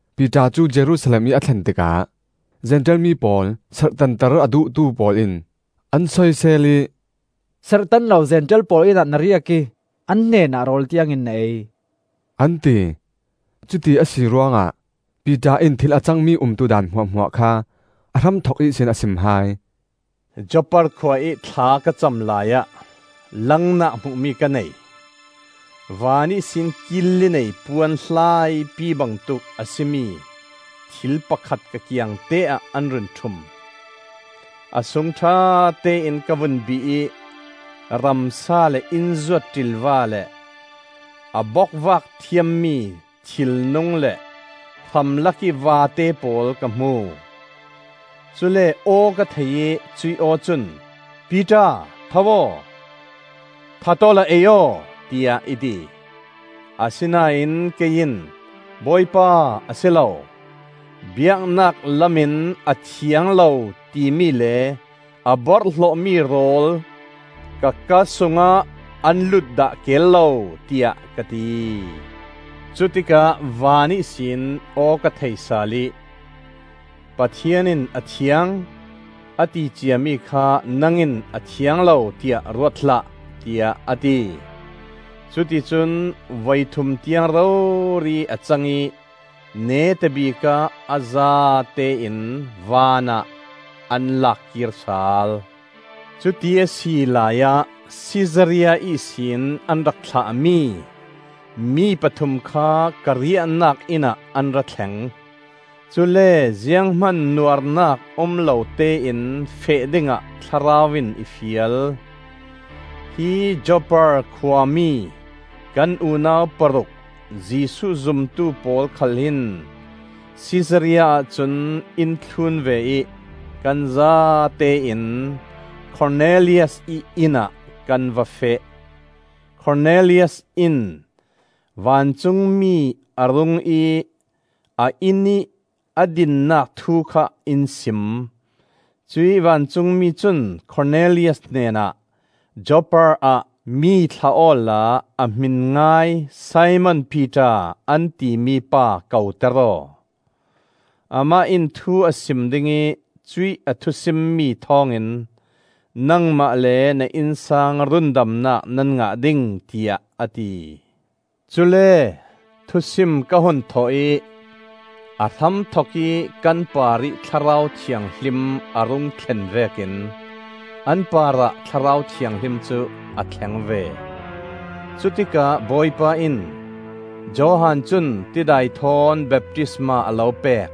Piter cu Jerusalem ih a thlen tikah Zentail mi pawl serhtanter a duhtu pawl in an soisel ih, “Serhtan lo Zentail pawl innah na riak ih an hnenah rawl tiangin na ei,” an ti. Cuti a si ruangah Piter in thil a cangmi umtudan hmuahhmuah kha a hramthok ihsin a sim hai. “Joppa khua ih thla ka cam laiah langnak hmuhmi ka nei. Van ihsin kil li nei puan hlaipi bangtuk a si mi thil pakhat ka kiangte-ah an run ṭhum. A sung ṭhatein ka vun bih ih ramsa le innzuat ṭilva le a bokvak thiammi thilnung le hramlakih vate pawl ka hmu. Cule aw ka thei ih cuih aw cun, ‘Piter, tho aw, that awla ei aw,’ tiah i ti. Asinain kei in, ‘Bawipa, a si lo! Biaknak lamin a thiang lo timi le a borhhlawhmi rawl ka kaa sungah an lut dah kel lo,’ tiah ka ti. Cutikah van ihsin aw ka thei sal ih, ‘Pathian in a thiang, a ti ciami kha nang in a thiang lo tiah ruat hlah,’ tiah a ti. Cuti cun voithum tiang rori a cang ih neta bikah a zatein vanah an lak kir sal. Cuti a si laiah Sisaria ihsin an rak thlahmi mi pathum kha ka riahnak inn ah an ra thleng. Cule zianghman nuarnak um lotein feh dingah Thlarau in i fial. Hi Joppa khua mi kan unau paruk, Jesuh zumtu pawl khal hin Sisaria ahcun in thlun ve ih kan zatein Kornelias ih inn ah kan va feh. Kornelias in vancungmi a rung ih a innih a dinnak thu kha in sim. Cuih vancungmi cun Kornelias hnenah, ‘Joppa ah mi thlah awla a hmin ngai Simon Piter an timi pa koter aw. Amah in thu a sim ding ih cuih a thusimmi thawngin nangmah le na innsang rundamnak nan ngah ding,’ tiah a ti. Cule thusim ka hun thawh ih a hramthok ih kan parih Thlarau Thianghlim a rung thlen vekin an parah Thlarau Thianghlim cu a thleng ve. Cutikah Bawipa in, ‘Johan cun tidai thawn baptisma a lo pek;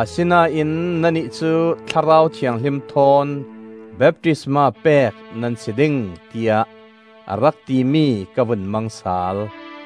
asinain nannih cu Thlarau Thianghlim thawn baptisma pek nan si ding,’ tiah a rak timi ka vun mang sal.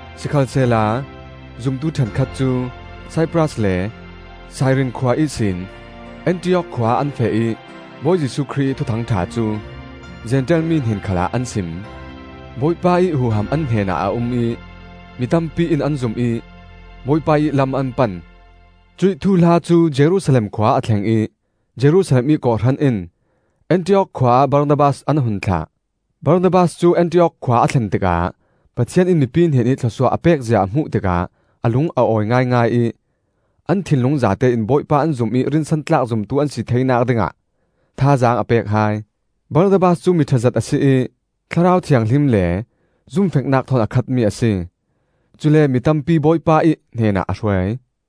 Sikhalsehla zumtu ṭhenkhat cu Saipras le Sairin khua ihsin Antiok khua ah an feh ih Bawi Jesuh Khrih ih Thuthang ṭha cu Zentail mi hnen khalah an sim. Bawipa ih huham an hnenah a um ih mi tampi in an zum ih Bawipa ih lam an pan. Cuih thuhla cu Jerusalem khua a thleng ih Jerusalem ih kawhhran in Antiok khua ah Barnabas an hun thlah. Barnabas cu Antiok khua a thlen tikah Pathian in mipi hnenih thlawsuah a pekzia a hmuh tikah a lung a awi ngaingai ih an thinlung zatein Bawipa an zum ih rinsantlak zumtu an si theinak dingah thazaang a pek hai. Barnabas cu miṭhazet a si ih Thlarau Thianghlim le zumfeknak thawn a khatmi a si. Cule mi tampi Bawipa ih hnenah a hruai.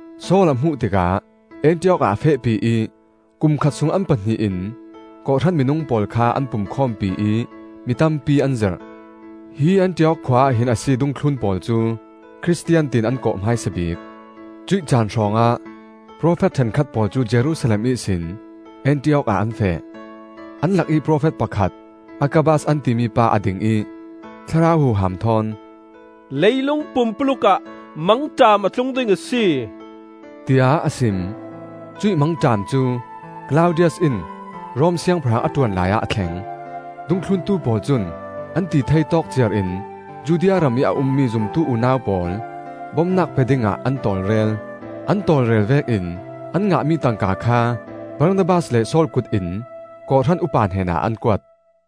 Saul a hmuh tikah Antiok ah a fehpi ih kum khat sung an pahnih in kawhhran minung pawl kha an pumkhawmpi ih mi tampi an zirh. Hi Antiok khua ah hin a si dungthlun pawl cu “Khristian” tiin an kawh hmaisa bik. Cuih caan hrawngah profet ṭhenkhat pawl cu Jerusalem ihsin Antiok ah an feh. An lakih profet pakhat Agabas an timi pa a ding ih Thlarau huham thawn, “Leilung pumpuluk ah mangṭam a tlung ding a si,” tiah a sim. (Cuih mangṭam cu Klaudius in Rom siangpahrang a ṭuan laiah a thleng.) Dungthluntu pawl cun an tithei tawk ciar in Judea ramih a ummi zumtu unau pawl bomnak pe dingah an tawlrel. An tawlrel vekin an ngahmi tangka kha Barnabas le Saul kut in kawhhran upa hnenah an kuat.